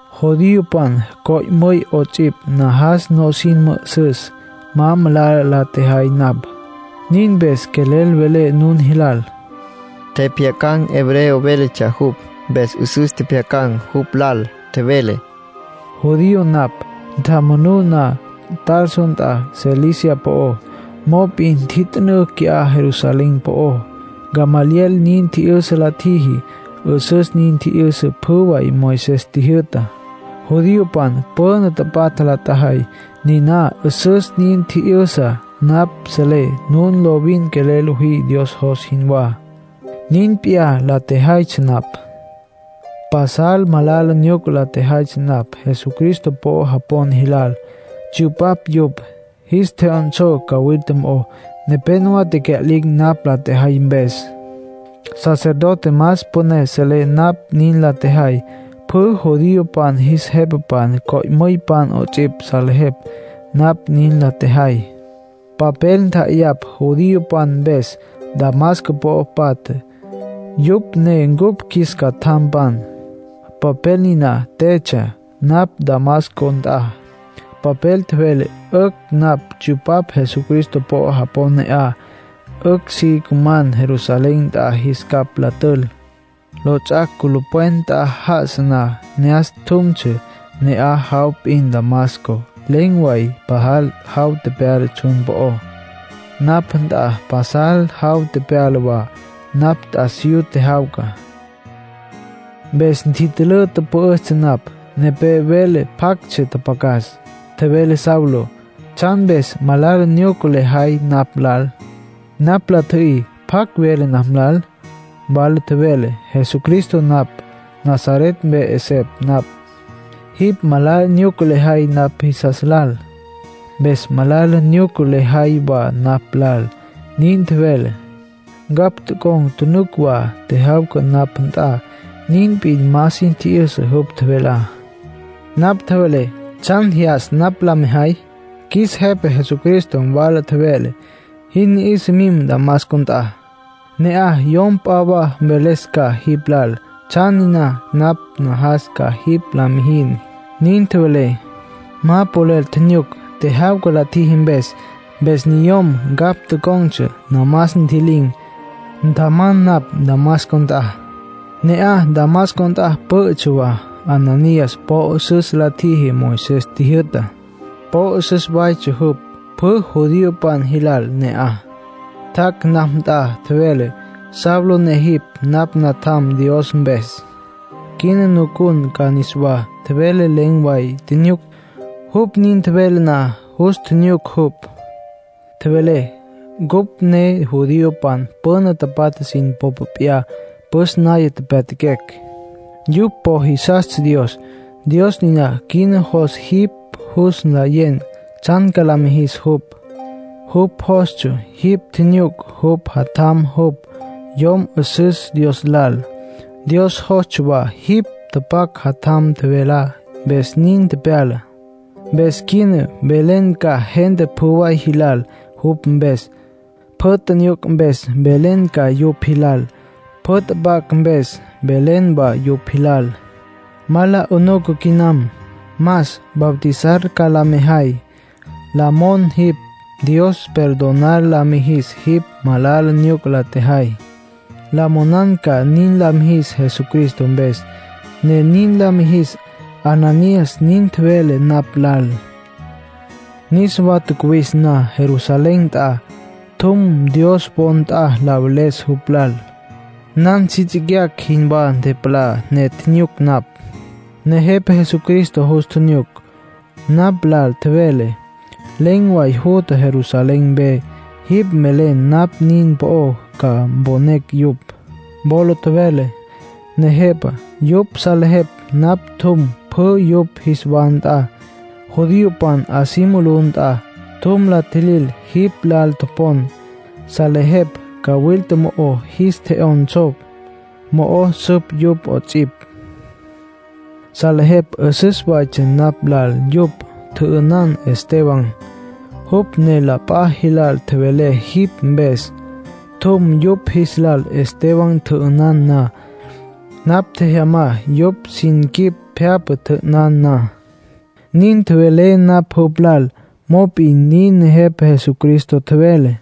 “Judiopan, co'müypan 'ots'ipj, najas nusin mü'üsüs ma malala la tjejay napj. Nin mpes quelel velé nun jilal”, nin tjevele. Tjepjyacan̈ hebreo véletsja jupj, mpes 'üsüs tjepjyacan̈ jupj lal. Tjevele: “Judío napj. Ntjamanuna Tarso nt'a Cilicia po'ó. Mop'in ntjit'ünǘ qui'á Jerusalén po'ó. Gamaliel nin tji'yüsa la tjiji. 'Üsüs nin tji'yüsa pjü way Moisés tjijyü'tá. Judiopan püna tapatja la tjajay, niná 'üsüs nin tji'yüsa. Napj selé nun lovin quelel lojí Dios jos jinwá. Nin p'iyá la tjejaytsja napj. Pasal malala nyuca la tjejay napj Jesucristo po'o japon jilal. Tsyupaptsja yupj, jis tje'yonsó wa cawilta mo'ó. Nepénowa tecya'lin̈ napj la tjejay mpes. Sacerdote más püné selé napj nin la tjejay. Pjü judiopan jis jepapan, co'müypan 'ots'ipj, salejepj napj nin la tjejay. Papel ntja'ayapj judiopan mpes Damasco po'o patja. Yupj ne cupj qjuis catjampan. Papel niná tjetsja napj Damasco nt'a. Papel tjevele 'ücj napj tsyupapj Jesucristo po'o japon ne'aj, 'ücj si cuman Jerusalén nt'a, jis capj la tül. ”Lots'ac' culupwen nt'a já'asa na, ne'as tjumtsja, ne'aj way p'in Damasco. Len̈ way pajal jaw tepyala tsjun po'ó. Napj nt'a pasal jaw tepyala wa, napj t'asiyú tjejyawca. Mpes ntitülǘ, tüpü'üstsja napj. Nepé vele pjactsja tjapjacas. Tjevele: ‘Saulo, ¿tsjan mpes malala nyuca lejay napj lal?’ Napj la tji'yüy: ‘¿Pjacj vele napj lal?’ Nawala tjevele: ‘Jesucristo napj, Nazaret mpe 'esepj napj. Jipj malala nyuca lejay napj jisas lal. Mpes malala nyuca lejay wa napj lal’, nin tjevele. Ncapj tocon̈ tjunuc wa tjejyawca napj nt'a, nin p'in ma sin tji'yüsa jupj tjevelá. Napj tjevelé: ‘¿Tsjan jyas napj la mejay?’ Qjuis Jepa Jesucristo nawala tjevele: ‘Jin ni'isa, mim Damasco nt'a. Ne'aj yom p'a wa mveles ca jipj lal tsjan niná napj najas ca jipj la mijin’, nin tjevele. Ma polel tjinyuc, tjejyawca la tjiji mpes. Mpes niyom ncapj tocon̈tsja namas ntji'lin̈, ntjaman napj Damasco nt'a. ”Ne'aj Damasco nt'a pü'ü watsja Ananías. Po 'üsüs la tjíjitsja Moisés tjijyü'tá. Po 'üsüs waytsja jupj pjü judiopan jilal ne'aj. Tjac' napj nt'a, tjevele: ‘Saulo, jipj ne napj natjam Dios mpes. Quina nucun ca niswá’, tjevele. Len̈ way tjinyuc, jupj nin tjevele na. Jus tjinyuc jupj. Tjevele: ‘Cupj ne judiopan püna tapatja sin popa p'iyá püs naya pyatjaquecj. Yupj po jisastsja Dios. Dios niná quina jos jipj jus nlayen tsjan ca la mijis jupj. Jupj jostsja jipj tjinyuc jupj Jatjam, jupj Yom 'Üsüs Dios Lal. Dios jostsja wa jipj tjapjac' Jatjam tjevelá. Mpes nin tepyala. Mpes quina mvelen ca gente pjü way jilal jupj mpes. Pjü tjinyuc mpes mvelen ca yupj jilal. Pjü tjapjac' mpes mvelen wa yupj jilal. Ma la 'unuca quinam. Mas, bautizar ca la mya jay. La monan jipj Dios perdonar la mya jis jipj, malala nyuca la tjejay. La monan ca nin la mijis Jesucristo mpes, ne nin la mijis’, Ananías nin tjevele napj lal. ”Niswa tjacuwis na Jerusalén nt'a, tjum Dios wo nt'a la veles jupj lal. Nan si tsicyacj jinwá ntepalá, ne tjinyuc napj. Nejepa Jesucristo jus tjinyuc. Napj lal tjevele: ‘Len̈ way jutja Jerusalén mpe. Jipj velen napj nin po'ó ma ca mponecj yupj.’ Wola tjevelé: ‘Nejepa, yupj salejepj napj tjum pjü yupj jis wa nt'a, judiopan 'a si mulú nt'a. Tjum la tjilil jipj lal topon. Salejepj cawilta mo'o jis tje'yonsó, mo'o süp yupj 'ots'ipj. Salejepj 'üsüs waytsja napj lal yupj tjü'ünan Esteban, jupj ne la p'a jilal tjevele jipj mpes. Tjum yupj jis lal Esteban tjü'ünan na. Napj tjejyamá yupj sin quip pje'apa, tjü'ünan na.’ Nin tjevelé napj jupj lal. Mop'in nin Nejepa Jesucristo tjevele: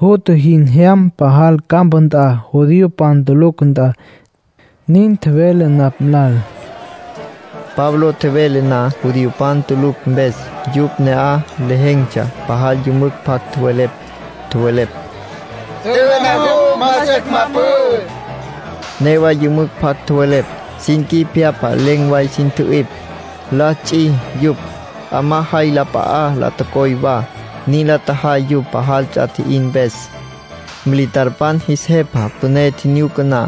‘Jutja. Jin jyam pasal campa nt'a, judiopan tulucj nt'a’, nin tjevele napj lal.” Pablo tjevele na judiopan tulucj mpes, yupj ne'aj lejen̈tsja pajal yümücj pjac tjowelepj. Tjowelepj: “Tjü'ü'ná jupj. Más 'ücj ma pü'ü”, nin tjowelepj. Newa yümücj pjac tjowelepj. Sin quip pje'apa len̈ way sin tjü'ipj, la ts'i yupj. 'Amá jay la p'a'a la tocoy wa. Nin la tjajay yupj pajal ts'a tji'in mpes. Militarpan jis jepa püné tjinyuca na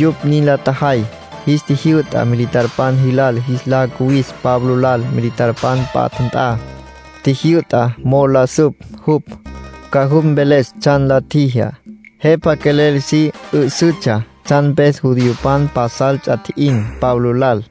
yupj nin la tjajay, jis tjijyü'ta militarpan jilal jis la cuwis Pablo lal militarpan patja nt'a. Tjijyü'ta mo'o la süp jupj, ca jupj mveles tsjan la tjijá. Jepa quelel si 'üsütsja tsjan mpes judiopan pasal ts'a tji'in Pablo lal.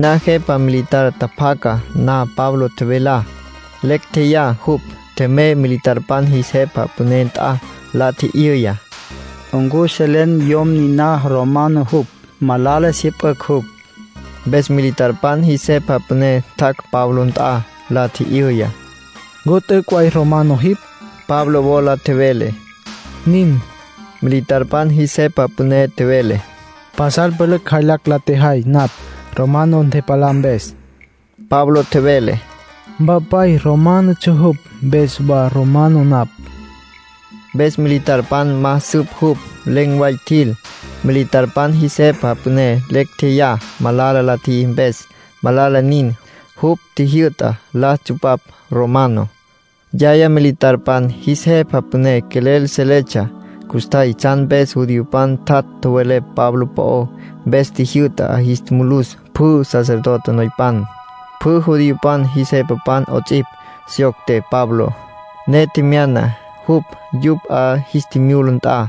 Niná jepa militar tjapjaca na Pablo tjevelá, lecj tjeyá jupj. Tjemey militarpan jis jepa püné nt'a. La tji'yüya: —¿Ncu selen yom niná romano jupj? Malala syüpücj jupj —nin tjevele. Mpes militarpan jis jepa püné tjac' Pablo nt'a, la tji'yüya: —¿Ncu t'üc' way romano jipj? Pablo wola tjevele: —Nin. Militarpan jis jepa püné tjevele: —Pasal pülücj jaylacj la tjejay napj, romano ntepalá mpes. Pablo tjevele: —Mpapay románotsja jupj, mpes wa romano napj —nin wola tjevele. Mpes militarpan ma süp jupj. Len̈ way tjil. Militarpan jis jepa püné lecj tjeyá malala la tjiji mpes. Malala nin, jupj tjijyü'ta la tsupapj romano. Yaya militarpan jis jepa püné quelel seletsja custjay tsjan mpes judiopan tjat' tjowelepj Pablo po'ó. Mpes tjijyü'ta 'a jis mulus pjü sacerdote noypan, pjü judiopan jis jepapan 'ots'ipj. Syocte Pablo, ne tjemyana jupj yupj 'a jis tjimyula nt'a.